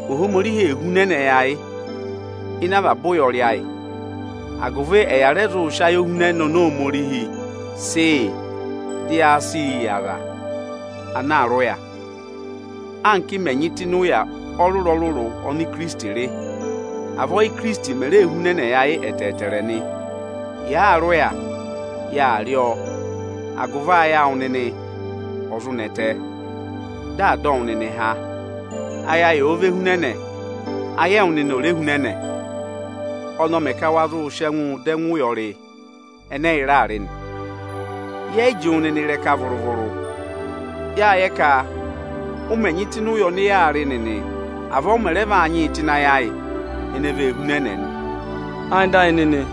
Ohomorihi ee hunẹnẹ yị ayị ịnị avaba ụyọrị ayị, agụvị ẹ̀ ya rẹ zụụ sị ayohunẹnẹ oni Ohomorihi sị yị, dị ya sịị yị aza ana àa rị ụya. Anka ị mẹ̀ nyị tụ́ ịnị ụya ọrụrụ-ọrụrụ ọnị Ikirisiti rị, avọọ ọza ọnọọ mè ree hunẹnẹ yị ayị ẹtẹẹtẹrẹ nị. Yàaa rị ụya, yaà rị ọọ agụvị ayị awụ nịnị ọ zụ nẹtẹ, dị à dọ wụ nịnị há hụụnị ụyọrị ọyaanị. Ayị ayị òo ve hunẹnẹ, agụvị ayị ẹwụ nịnị ò re hunẹnẹ yọ nị. Ọnị ọ mẹ ka wa zụ sị ẹngụ dọ ẹngụ ụyọrị ẹnẹ ẹyị raa rị nị. Yẹ yị jị wụ nịnị ịrẹka vụrụ-vụrụ. Yâ yẹ ka ụ mẹ nyị tụ́ ịnị ụya ọnị yaa rị nịnị, avọọ ụ mẹ rẹ vaa nyịị tụ́ ịnị ayị ayị ene vee hunẹnẹ nịnị nị.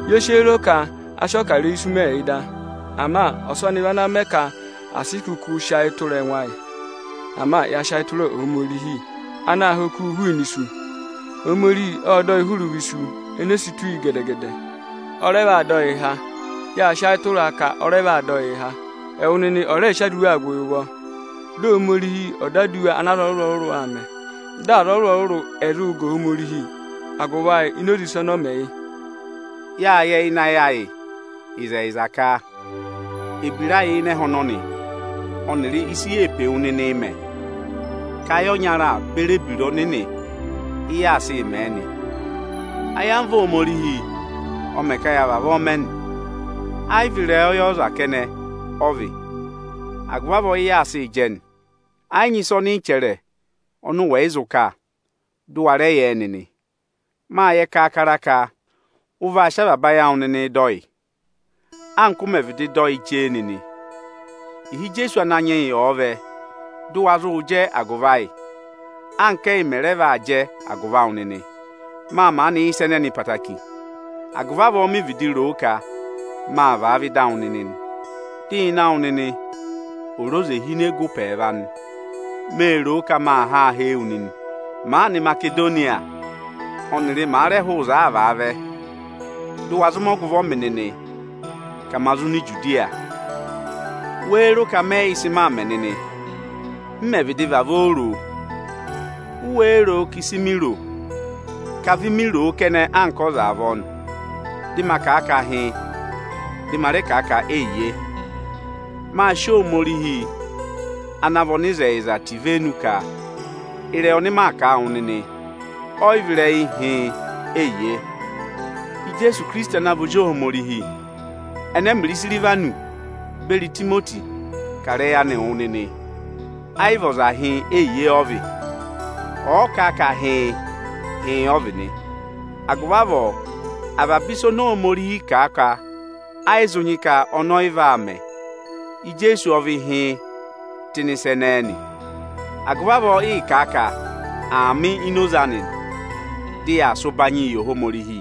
Ye si o ro ka a sị ọkarẹyị isu mẹẹ yị da. Ama ọsọnị vị ana mẹ ka à sị kụkụ sị ayị tụra ẹngụ ayị, ama ya sị ayị tụra Ohomorihi anaā ha okuu hụụnị isu. Ohomorihi ộ dọ yị hụrị ụvọ isu ene si tù yi gede-gede. Ọ rẹ vaa dọ yịị há. Yâ sị ayị tụra a ka ọ vaa dọ yịị há. Ẹwụ nịnị ọ̀ rẹẹ sị aduwaa gụ yị ụvọ, dị Ohomorihi ọ̀ dọ aduwa ọnị aza ọrụrụ-ọrụrụ mẹ, dị aza ọrụrụ-ọrụrụ ẹ̀ zụụ ga Ohomorihi agụvị ayị ini oze ịsa ọnị ọ mẹ yị. Yâ yẹ ịnị ayị ịzẹyịza ka ebira ayị ịnị ẹhẹ ọnọnị ọnịrị ịsị yee pe wu nịnịị mẹ, ka ayị ọnya beri ebira Ohomorihi ị yaa sịị mẹ̀ ẹ nị. Ayamva Ohomorihi ọ mẹ ka ya vavọọ mẹ nị. Ẹ yị vị ịrẹyọyẹ ọza kẹnẹ ọ vị. Agụvị avọọ ị yaa sịị jẹ nị. Ẹ yị nyị ịsa ọnị ị chẹrẹ ọnị ụ wẹ̀ yị zụ kà, dụ wa rẹ yẹẹ nịnị. Mâ yẹ kaakara ka ụ vaa sị avaba ayị awụ nịnịị dọ yị, anka ụ mẹ̀ vịdị dọ yị chee nịnị. Ịhị Ijeesu Ananyị yị ọ̀ọ vẹ, dụ wa zụụ jẹ agụvị ayị, anka ẹ́yị mẹ̀ raa jẹ agụvị awụ nịnị. Mâ maanị yẹ ịsa ẹnẹnị ẹtẹẹtẹrẹ, agụvị avọọ mi vịdị roo ka maa vaa vẹ ịda awụ nịnị, dị ịnẹ awụ nịnị ò re oze hine gụ ụpẹ ẹẹva nị. Mê ro ka maa ha hee wu nịnị, màaa nọ Imasedoniya ọnịrị màa rẹ hụụ ịzọọ aa vaa vẹ, dụ wa zụ mẹ ọgụvọ mị nịnị ka ma zụ nọ Ijudiya. Wéé ro ka mẹyị yẹ ịsị maa mẹ̀ nịnị, m mẹ̀ vịdị vavọọ roo? U wéé ro ka ịsị mi ro ka vi mi roo kẹnẹ anka ọza avọọ nị, dị maa kà a ka hịịn, dị ma rẹ kà a ka eyiye? Mâ sị Ohomorihi ana vị ọnịzẹyịza tẹ ivenu ka ịrẹyị ọnị mị kà wụ nịnị, ọyị vị ịrẹyị hịịn, eyiye. Ijeesu Ikirisiti ana vị Ozi Ohomorihi ẹnẹ ẹmịrị Isirivanọsị beri Itimoti kà ịrẹyị anịị wụ nịnị, ayị vị ọza hịịn eyiye ọ vị. Ọ̀ọ kà a ka “hịịn”, “hịịn” ọ vị nị. Agụvị avọọ avaba ịsa oni Ohomorihi kà a ka ayị zụ nyị ka ọnị ọyị vaa mẹ, Ijeesu ọ vị hịịn tụ́ ịnị ịsa ẹnẹẹ nị. Agụvị avọọ ịị̄ kà a ka “Aamị” ini oze anị nị, dị yaa sị ụbanyịị yị Ohomorihi.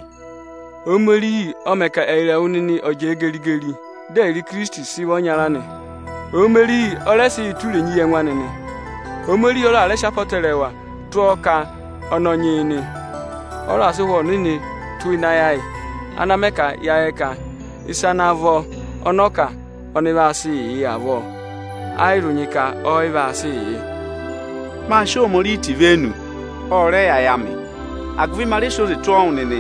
Ohomorihi ọ mẹ ka ẹyịrị ẹwụ nịnị ọ̀ jẹẹ geri-geri, dị ẹyịrị Ikirisiti sị vị ọnya nị. Ohomorihi ọ rẹ sị yị tụ́ irenyi yị ẹngụ anị nị. Ohomorihi ọ raà sị apọtẹrẹwa tụ́ ọọ ka ọnị ọ nyị yị nị. Ọ raà sị Ụhwẹ Ohomorihi tụ́ ịnị ayị ayị, ana mẹ ka ya yẹ ka ịsa ana vọ ọnị ọ kà ọnị vaa sịị yị avọọ, ayị zụ nyị ka ọ yị vaa sịị yị. Mâ sị Ohomorihi tẹ ivenu, ọ rẹ yẹ ayị amị. Agụvị ma rẹ sị oze tụ́ ọọ wụ nịnị,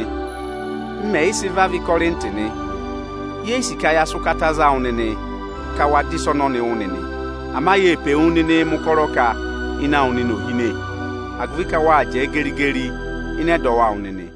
m mẹẹ̀yị sị vavẹ Ịkọrịntị nị. Ye yi sì ka ya sị ụkata za wụ nịnị ka wa dọ ịsa ọnọnị wụ́ nịnị. Ama yee pe wu nịnịị mẹ̀ ụkọrọ ka ịnẹ awụ nịnị ò hine, agụvị ka wâ jẹẹ geri-geri ịnị ẹdọwụ awụ nịnị.